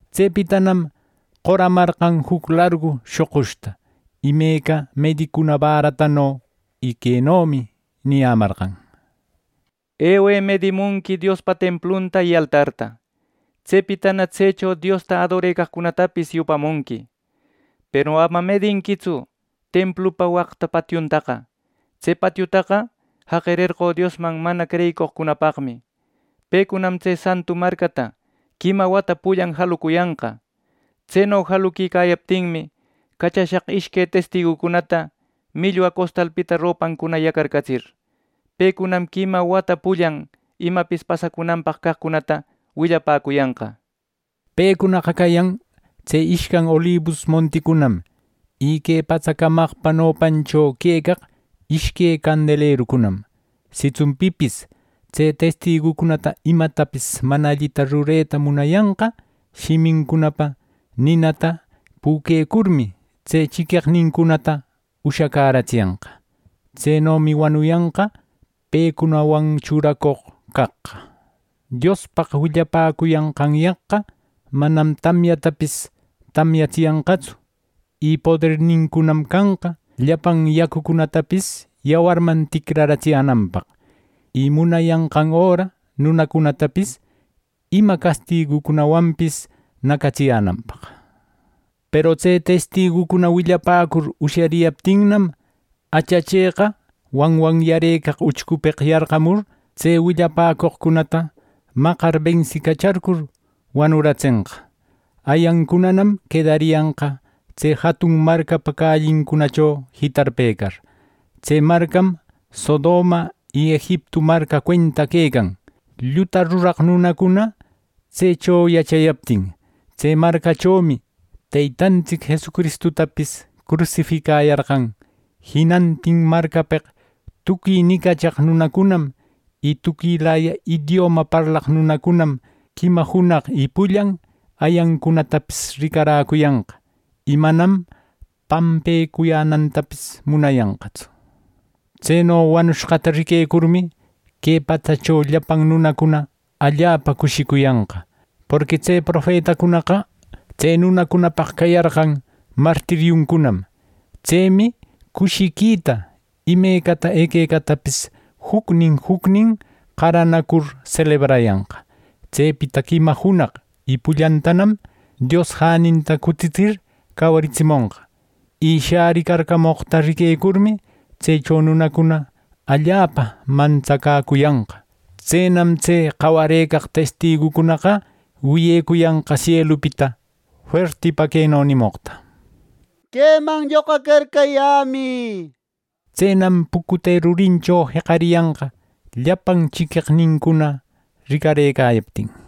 Tsepitanam qoramarqan juc largu shoqushta imeca medicuna bäratano, y quenomi niyämarqan: “Ewë medimunqui Diospa templunta y altarta. Tsepitana tsecho Diosta adorecaqcunatapis yupamunqui. Peru ama medinquitsu templupa waqta patiuntaqa. Tse patiutaqa jaqirerqö Diosman mana creyicoqcunapaqmi. Pecunam tse santu marcata quima wata pullan jalucuyanqa. Tseno jaluquicayaptinmi, cachashaq ishque testigucunata millwa costalpita ropancuna yacarcatsir. Pecunam quima wata pullan imapis pasacunanpaq caqcunata willapäcuyanqa” nir. Pecunaqa cayan tse ishcan olibus monticunam, y que patsa camaqpa nopancho quecaq ishque candelerucunam. Sitsun pipis tse testigucunata imatapis mana allita rureta munayanqa, shimincunapa ninata püquecurmi, tse chiqueqnincunata ushacäratsiyanqa. Tsenomi wanuyanqa pecunawan churacoq caqqa. Diospaq willapäcuyanqanyaqqa manam tamyatapis tamyatsiyanqatsu. Y podernincunam canqa llapan yacucunatapis yawarman ticraratsiyänanpaq, y munayanqan öra nunacunatapis ima castigucunawanpis nacatsiyänanpaq. Peru tse testigucuna willapäcur ushariyaptinnam, achacheqa wanwanyarëcaq uchcupeq yarqamur, tse willapäcoqcunata maqar bensicacharcur, wanuratsenqa. Ayancunanam quedariyanqa tse jatun marcapa callincunacho jitarpecar. Tse marcam Sodoma, y Egiptu marca cuenta quecan ˻lluta ruraq nunacuna tsecho yachayaptin˼. Tse marcachomi Teytantsic Jesucristutapis crusificayarqan. Jinantin marcapeq tuqui nicachaq nunacunam y tuquilaya idioma parlaq nunacunam, quima junaq y pullan ayancunatapis ricaräcuyanqa, y manam pampecuyänantapis munayanqatsu. Tseno wanushqata riquecurmi, que patsacho llapan nunacuna allapa cushicuyanqa. Porqui tse profetacunaqa tse nunacunapaq cayarqan martiriuncunam. Tsemi cushiquita imecata equecatapis jucnin jucnin qaranacur selebrayanqa. Tsepita quima junaq y pullantanam Dios jäninta cutitsir cawaritsimonqa. Y shäricarcamoqta riquecurmi, tsecho nunacuna allapa mantsacäcuyanqa. Tsenam tse cawareq testigucunaqa wiyecuyanqa sielupita fuertipa queno nimoqta: “Queman lloqacarcayämï” nir. Tsenam pucute rurincho jeqariyanqa llapan chiqueqnincuna ricarëcayaptin.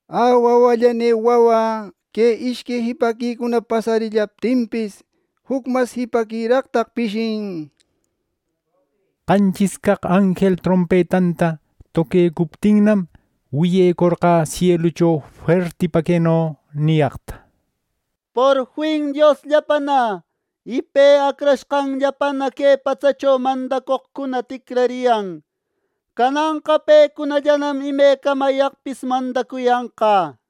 ¡Ä wawallanï wawä! Que ishque jipaquicuna pasarillaptinpis, juc mas jipaquiraqtaq pishin. Qanchis caq anjel trompetanta toquecuptinnam, wiyecorqä sielucho fuertipa queno niyaqta: “Porfin Diosllapana y Pe Acrashqanllapana que patsacho mandacoqcuna ticrariyan. Cananqa pecunallanam imecamayaqpis mandacuyanqa” nir.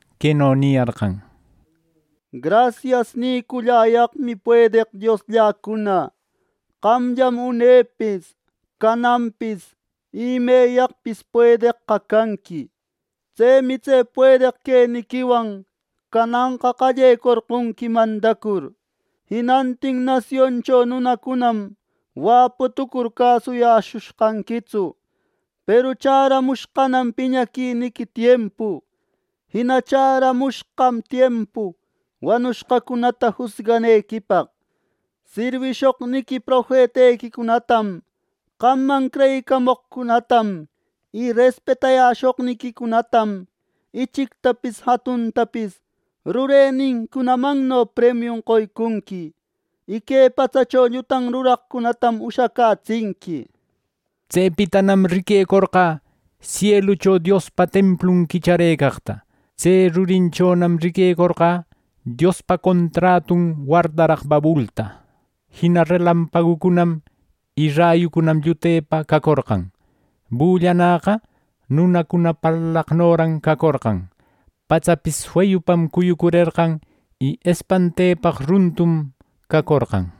queno niyarqan: “Grasias niculläyaqmi puedeq Dioslläcuna. Qamllam unepis, cananpis y ˻imeyaqpis˼ puedeqqa canqui. Tsemi tse puedeq queniquiwan cananqa qallecorqonqui mandacur. Jinantin nasioncho nunacunam waputucur cäsuyashushqanquitsu, peru chäramushqanam piñaquiniqui tiempu. Jina chäramushqam tiempu wanushqacunata jusganequipaq. Sirwishoqniqui profetequicunatam qamman creyicamoqcunatam, y respetayäshoqniquicunatam ichictapis jatuntapis rurenincunamanno premiun qoycunqui. Y que patsacho llutan ruraqcunatam ushacätsinqui” nir. Tsepitanam riquecorqä sielucho Diospa templun quichacäreqta. Tse rurinchonam riquecorqä Diospa contratun wardaraq babulta. Jina relampagucunam y rayucunam llutepa cacorqan. Bullanäqa nunacuna parlaqnoran cacorqan. Patsapis feyupam cuyurerqan y espantepaq runtum cacorqan.